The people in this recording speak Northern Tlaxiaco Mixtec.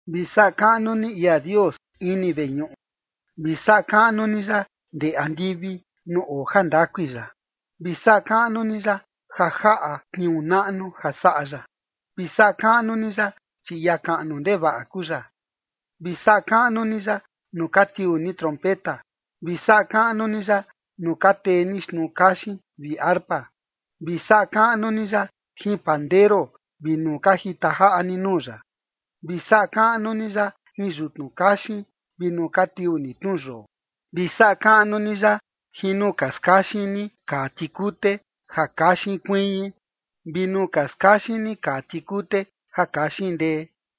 Vi saꞌa kaꞌnu ni ia Dios ini veñuꞌu. Vi saꞌa kaꞌnu ni ya ndee andivi nuu oo jandakui ya. Vi saꞌa kaꞌnu ni ya ja jaꞌa tniuu naꞌnu ja saꞌa ya. Vi saꞌa kaꞌnu ni ya, chi ia kaꞌnu ndevaꞌa kuu ya. Vi saꞌa kaꞌnu ni ya nuu ka tiuu ni trompeta. Vi saꞌa kaꞌnu ni ya nuu ka tee ni xtnuu kaxin vi arpa. Vi saꞌa kaꞌnu ni ya jin pandero vi nuu ka jita jaꞌa ni nuu ya. Vi saꞌa kaꞌnu ni ya jin yutnu kaxin vi nuu ka tiuu ni tnu yoo. Vi saꞌa kaꞌnu ni ya jin nuu ka skaxin ni kaa tikute ja kaxin kuiñi, vi nuu ka skaxin ni kaa tikute ja kaxin ndee.